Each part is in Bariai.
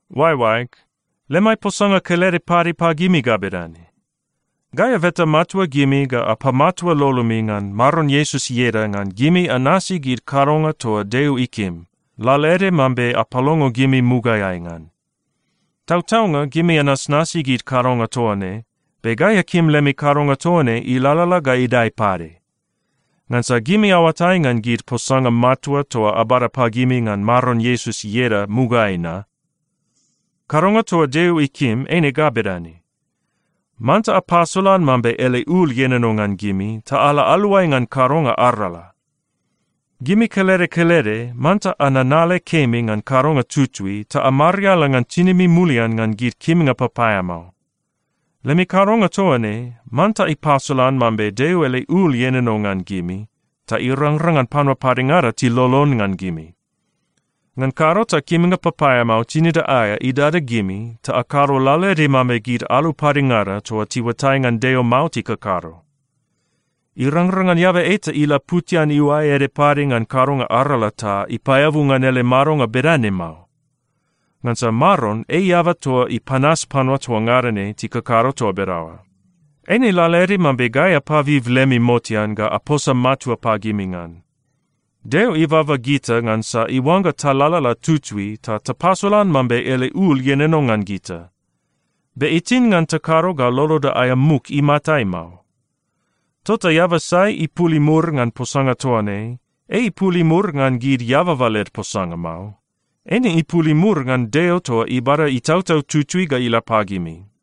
Oaeoaeg, lemai posanga kelede pade pagimi ga bedane: Gai abeta matua gimi ga apamatua lolomi ngan Maron Iesus ieda ngan gimi anasi gid kadonga toa Deo ikim, lalaede mambe apalongo gimi mugaeai ngan. Tautaunga, gimi anasnasi gid kadonga toa ne, be gai akim lemi kadonga toa ne ilalala ga idae pade. Ngansa gimi aoatai ngan gid posanga matua toa abada pagimi ngan Maron Iesus ieda mugaeai na. Kadonga toa Deo ikim eine ga bedane: Manta apasolan mambe ele ul ienono ngan gimi ta ala aluai ngan kadonga arala. Gimi kelede kelede manta ananale kemi ngan kadonga tutui ta amariala ngan tinimi mulian ngan gid kimnga papaeamao. Lemi kadonga toa ne manta ipasolan mambe Deo ele ul ienono ngan gimi ta irangrang ngan panua padengada tilolon ngan gimi. Ngan kado ta kimnga papaeamao tinida aea idada gimi ta akado lalaede mambe gid alu padengada toa tiuatai ngan Deo mao tikakado. Irangrang ngan eaba eta ilaputian iuae ede pade ngan kadonga arala ta ipaeabu ngan ele madonga bedane mao. Ngansa Maron ei eaba toa ipanas panua toa ngada ne tikakado toa bedaoa. Eine lalaede mambe gai apabib lemi motean ga aposa matua pagimi ngan. Deo ibaba gita ngansa iuangga talalala tutui ta tapasolan mambe ele ul ienono ngan gita. Be itin ngan takado ga loloda aea muk imatai mao. Tota eaba sai ipul imur ngan posanga toa ne, ei ipul imur ngan gid eababa led posanga mao. Eine ipul imur ngan Deo toa ibada Itautau Tutui ga ila pagimi.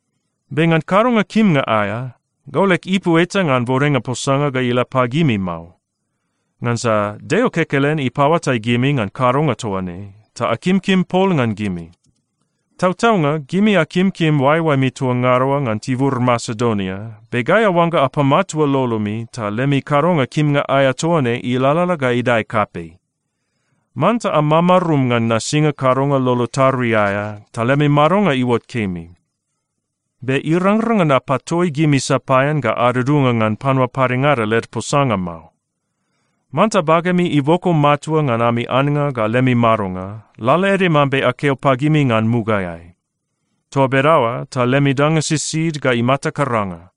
Be ngan kadonga kimnga aea, gau leg ipu eta ngan bodenga posanga ga ila pagimi mao. Ngansa Deo kekelen ipaoatai gimi ngan kadonga toa ne, ta akimkim pol ngan gimi. Tautaunga, gimi akimkim oaeoaemi toa ngada oa ngan tibur Masedonia, be gai aoangga apamatua lolomi ta lemi kadonga kimnga aea toa ne ilalala ga idae kapei. Manta amamarum ngan nasinga kadonga lolo tarui aea ta lemi madonga iuot kemi. Be irangrang ngan apatoi gimi sapaean ga adudunga ngan panua padengada led posanga mao. Manta bagemi iboko matua ngan ami annga ga lemi madonga, lalaede mambe akeo pagimi ngan mugaeai. Toa bedaoa ta lemi danga sisid ga imata karanga.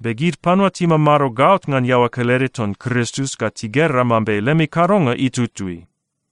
Be gid panua timamado gaot ngan iaoa kelede ton Kristus ga tigera mambe lemi kadonga itutui.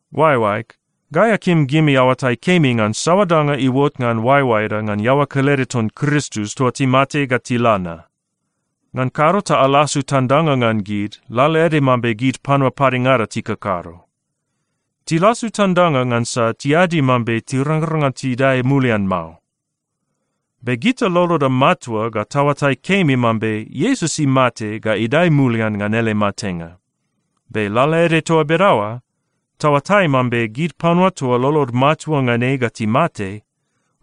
Oaeoaeg, gai akim gimi aoatai kemi ngan saoa danga iuot ngan oaeoaeda ngan iaoa kelede ton Kristus toa timate ga tila na. Ngan kado ta alasu tandanga ngan gid lalaede mambe gid panua padengada tikakado. Tilasu tandanga ngansa tiadi mambe tirangrang ngan tidae mulian mao. Be gita loloda matua ga taoatai kemi mambe Iesus imate ga idae mulian ngan ele matenga. Be lalaede toa bedaoa, taoatai mambe gid panua toa lolod matua ngan ei ga timate,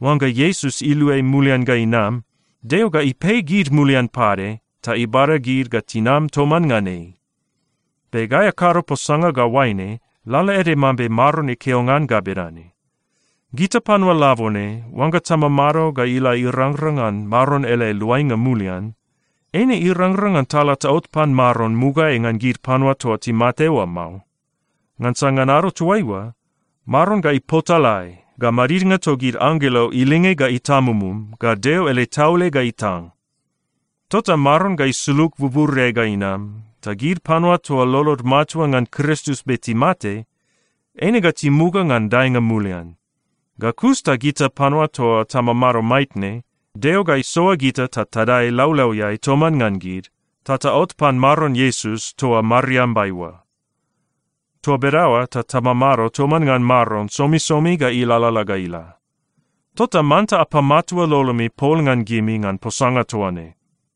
oangga Iesus iluai mulian ga inam, Deo ga ipei gid mulian pade ta ibada gid ga tinam toman ngan ei. Be gai akado posanga ga oaine lalaede mambe Maron ikeo ngan ga bedane: Gita panua labone, oangga tamamado ga ila irangrang ngan Maron ele luainga mulian, eine irangrang ngan tala taot pan Maron mugaeai ngan gid panua toa timate oa mao. Ngansa ngan ado toaiua, Maron ga ipotalae, ga madidnga togid anggelo ilinge ga itamumum, ga Deo ele taule ga itang. Tota Maron ga isulug buburiai ga inam, ta gid panua toa lolod matua ngan Kristus be timate, eine ga timuga ngan daenga mulian. Ga kus ta gita panua toa tamamado maitne, Deo ga isoa gita ta tadae laulauiai toman ngan gid, ta taot pan Maron Iesus toa mariambai oa. Toa bedaoa ta tamamado toman ngan Maron somisomi ga ilalala ga ila. Tota manta apamatua lolomi pol ngan gimi ngan posanga toa ne.